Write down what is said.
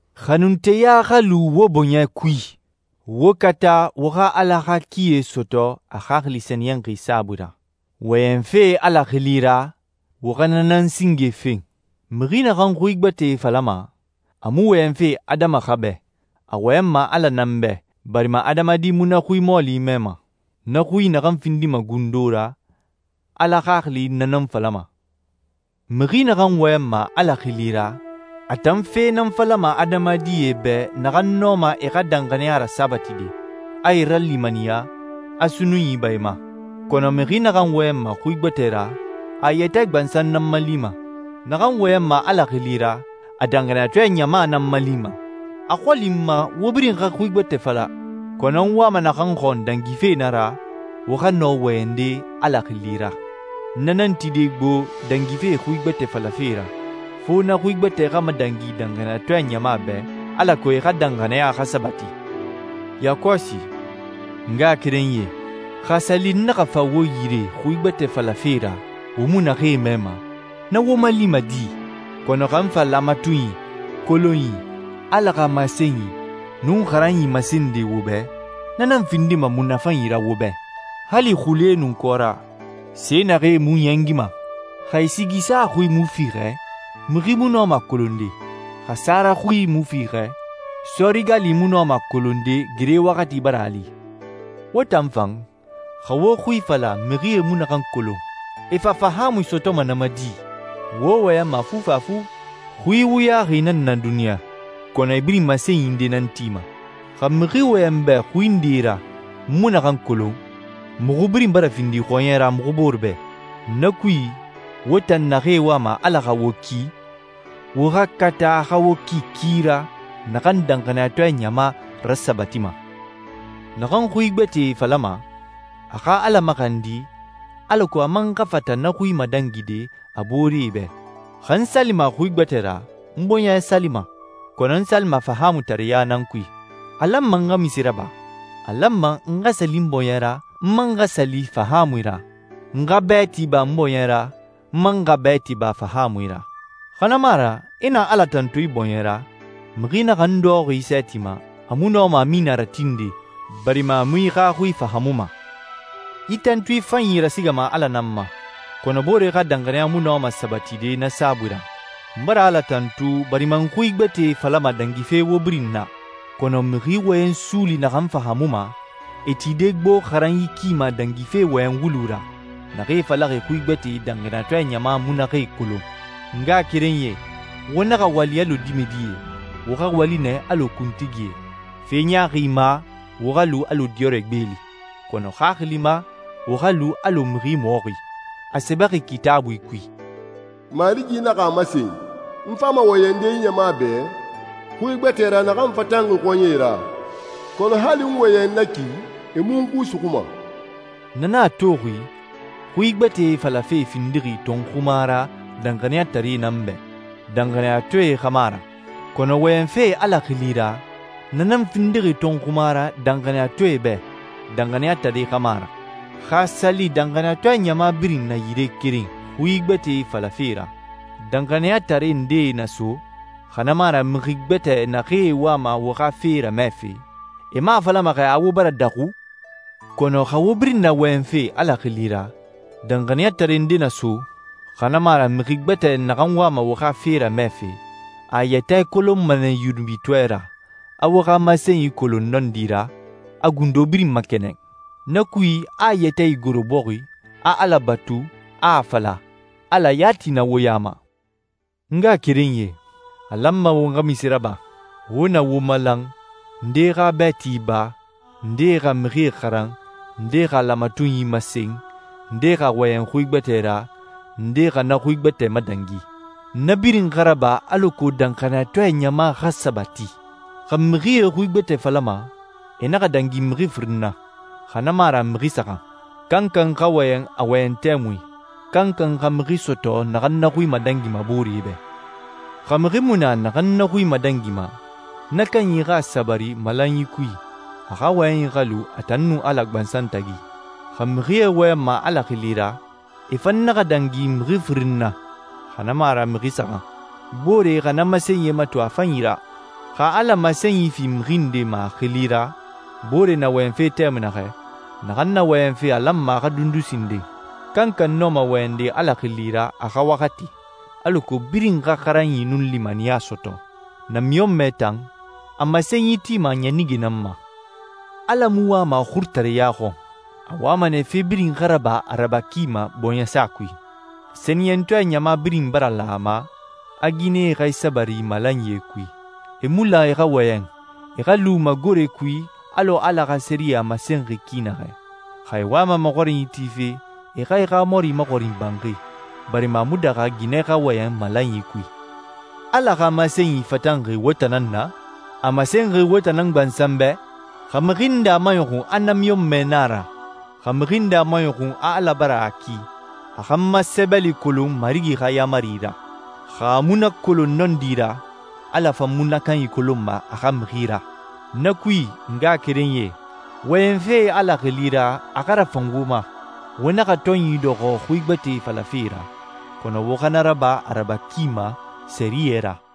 Xanunteya xa lu wo bɔɲɛ kui. Wo kata wo xa Ala xa kie sɔtɔ a Xaxili Sɛniyɛnxi saabui ra. Wɔyɛnfe Ala xili ra, wo xa na nan singe fen. Mixi naxan xui gbɛtɛe falama, a mu wɔyɛnfe adama xa bɛ, a wɔyɛnma Ala nan bɛ, barima adamadi mu na xui mɔɔli mɛma. Na xui naxan findima gundo ra, Ala Xaxili na nan falama. Mixi naxan wɔyɛnma Ala xili ra, a tan fe nan falama adamadie bɛ naxan nɔma e xa danxaniya rasabatide, a e ralimaniya, a sunnunyi ba e ma. Kɔnɔ mixi naxan wɔyɛnma xui gbɛtɛe ra, a a yɛtɛ gbansan nan malima. Naxan wɔyɛnma Ala xili ra, a danxaniyatɔɛ ɲama nan malima. A xɔli n ma wo birin xa xui gbɛtɛe fala, kɔnɔ n wama naxan xɔn dangife na ra, wo xa nɔ wɔyɛnde Ala xili ra. Na nan tide gbo dangife xui gbɛtɛe falafe ra, fo na xui gbɛtɛe xa madangi danxaniyatɔɛ ɲama bɛ, alako e xa danxaniya xa sabati. Yakɔsi, n ngaxakerenyie, xa a sa li n naxa fa wo yire n xui gbɛtɛe falafe ra wo mu naxee mɛma, na wo malima di? Kɔnɔ xa n fa laamatunyi, kolonyi, Ala xa masenyi, nun xaranyi masende wo bɛ, na nan findima munafanyi ra wo bɛ. Hali xule nun kɔra, se naxee mu ɲɛngima, xa e sigi sa xui mu fiixɛ, mixi mu nɔma a kolonde. Xa sara xui mu fiixɛ, sɔɔri gali mu nɔma a kolonde gere waxati bara a li. Wo tan fan, xa wo xui fala mixie mu naxan kolon, e fa fahaamui sɔtɔma na ma di? Wo wɔyɛnma fufafu. Xui wuyaxi nan na duniɲa, kɔnɔ e birin masenyi nde nan tima. Xa mixi wɔyɛn n bɛ xui nde ra n mu naxan kolon, muxu birin bara findi xɔɲɛ ra muxu bore bɛ. Na kui, wo tan naxee wama Ala xa wo ki, wo xa kata a xa wo ki ki ra naxan danxaniyatɔɛ ɲama rasabatima. Naxan xui gbɛtɛe falama, a xa Ala maxandi alako a man xa fata na xui madangide a booree bɛ. Xa n salima xui gbɛtɛe ra, n bɔɲɛ salima, kɔnɔ n salima fahaamutareɲa nan kui. A lanma n xa munse raba? A lanma n xa sali n bɔɲɛ ra, n man xa sali fahaamui ra. N xa bɛɛti ba n bɔɲɛ ra, n man xa bɛɛti ba fahaamui ra. Xa na mu a ra, i na Ala tantu i bɔɲɛ ra, mixi naxan dɔxɔxi i sɛɛti ma, a mu nɔma «Amina» ratinde, barima a mu i xa xui fahaamuma. I tantui fanyi rasigama Ala nan ma, kɔnɔ boore xa danxaniya mu nɔma sabatide na saabui ra. N bara Ala tantu, barima n xui gbɛtɛe falama dangife wo birin na, kɔnɔ mixi wɔyɛn suuli naxan fahaamuma, e tide gbo xaranyi ki ma dangife wɔyɛn wulu ra, naxee falaxi xui gbɛtɛe danxaniyatɔɛ ɲama mu naxee kolon. N ngaxakerenyie, wo naxa wali alɔ dimɛdie, wo xa wali nɛ alɔ kuntigie. Fe ɲaaxi ma, wo xa lu alɔ diyɔrɛ gbeeli. Kɔnɔ xaxili ma, wo xa lu alɔ mixi mɔxi. A sɛbɛxi Kitaabui kui, «Marigi naxa a masen, ‹N fama wɔyɛnde yi ɲama bɛ xui gbɛtɛ ra naxan fatanxi xɔɲɛe ra, kɔnɔ hali n wɔyɛn na ki, e mu n xui suxuma.›» Na nan a toxi, xui gbɛtɛe falafe findixi tɔnxuma ra danxaniyataree nan bɛ, danxaniyatɔɛe xa mu a ra. Kɔnɔ wɔyɛnfe Ala xili ra, na nan findixi tɔnxuma ra danxaniyatɔɛe bɛ, danxaniyataree xa mu a ra. Xa a sa li danxaniyatɔɛ ɲama birin na yire keren xui gbɛtɛe falafe ra, danxaniyatare ndee na so, xa na mu a ra mixi gbɛtɛ naxee wama wo xa fe ramɛfe, e mu a falama xɛ a wo bara daxu? Kɔnɔ xa wo birin na wɔyɛnfe Ala xili ra, danxaniyatare nde na so, xa na mu a ra mixi gbɛtɛ naxan wama wo xa fe ramɛfe, a a yɛtɛ kolonma nɛ yunubitɔɛ ra, a wo xa masenyi kolon nɔndi ra, a gundo birin makɛnɛn. Na kui, a a yɛtɛ igoro bɔxi, a Ala batu, a a fala, «Ala yati na wo ya ma.» N ngaxakerenyie, a lanma won xa munse raba? Wo na wo malan, ndee xa bɛɛti ba, ndee xa mixie xaran, ndee xa laamatunyi masen, ndee xa wɔyɛn xui gbɛtɛ ra, ndee xa na xui gbɛtɛ madangi. Na birin xa raba alako danxaniyatɔɛ ɲama xa sabati. Xa mixie xui gbɛtɛe falama, e naxa dangi mixi firin na, xa na mu a ra mixi saxan. Kankan xa wɔyɛn a wɔyɛn tɛmui, kankan xa mixi sɔtɔ naxan na xui madangima booree bɛ. Xa mixi mu na naxan na xui madangima, na kanyi xa a sabari malanyi kui, a xa wɔyɛnyi xa lu a tan nun Ala gbansan tagi. Xa mixie wɔyɛnma Ala xili ra, e fan naxa dangi mixi firin na, xa na mu a ra mixi saxan. Booree xa na masenyie mato a fanyi ra. Xa Ala masenyi fi mixi nde ma a xili ra, boore na wɔyɛnfe tɛmui naxɛ, naxan na wɔyɛnfe a lanma a xa dundu sinden. Kankan nɔma wɔyɛnde Ala xili ra a xa waxati, alako birin xa xaranyi nun limaniya sɔtɔ. Namiɲɔnmɛ tan, a masenyi tima a ɲanige nan na. Ala mu wama xurutareɲa xɔn, a wama nɛ fe birin xa raba a raba ki ma bɔɲɛsa kui. Sɛniyɛntɔɛ ɲama birin bara lan a ma, a ginɛe xa e sabari malanyie kui. E mu lan e xa wɔyɛn, e xa lu magore kui alɔ Ala xa sɛriyɛ a masenxi ki naxɛ. Xa e wama maxɔrinyi tife, e xa e xa mɔri maxɔrin banxi, barima a mu daxa ginɛ xa wɔyɛn malanyi kui. Ala xa masenyi fatanxi wo tan nan na? A masenxi wo tan nan gbansan bɛ? Xa mixi nde a maɲɔxun a namiɲɔnmɛ na a ra, xa mixi nde a maɲɔxun a Ala bara a ki, a xa n ma sɛbɛli kolon Marigi xa yaamari ra. Xa a mu na kolon nɔndi ra, Ala fan mu na kanyi kolonma a xa mixi ra. Na kui, n ngaxakerenyie, wɔyɛnfe Ala xili ra a xa rafan wo ma. Wo naxa tɔnyi dɔxɔ xui gbɛtɛe falafe ra, kɔnɔ wo xa na raba a raba ki ma sɛriyɛ ra.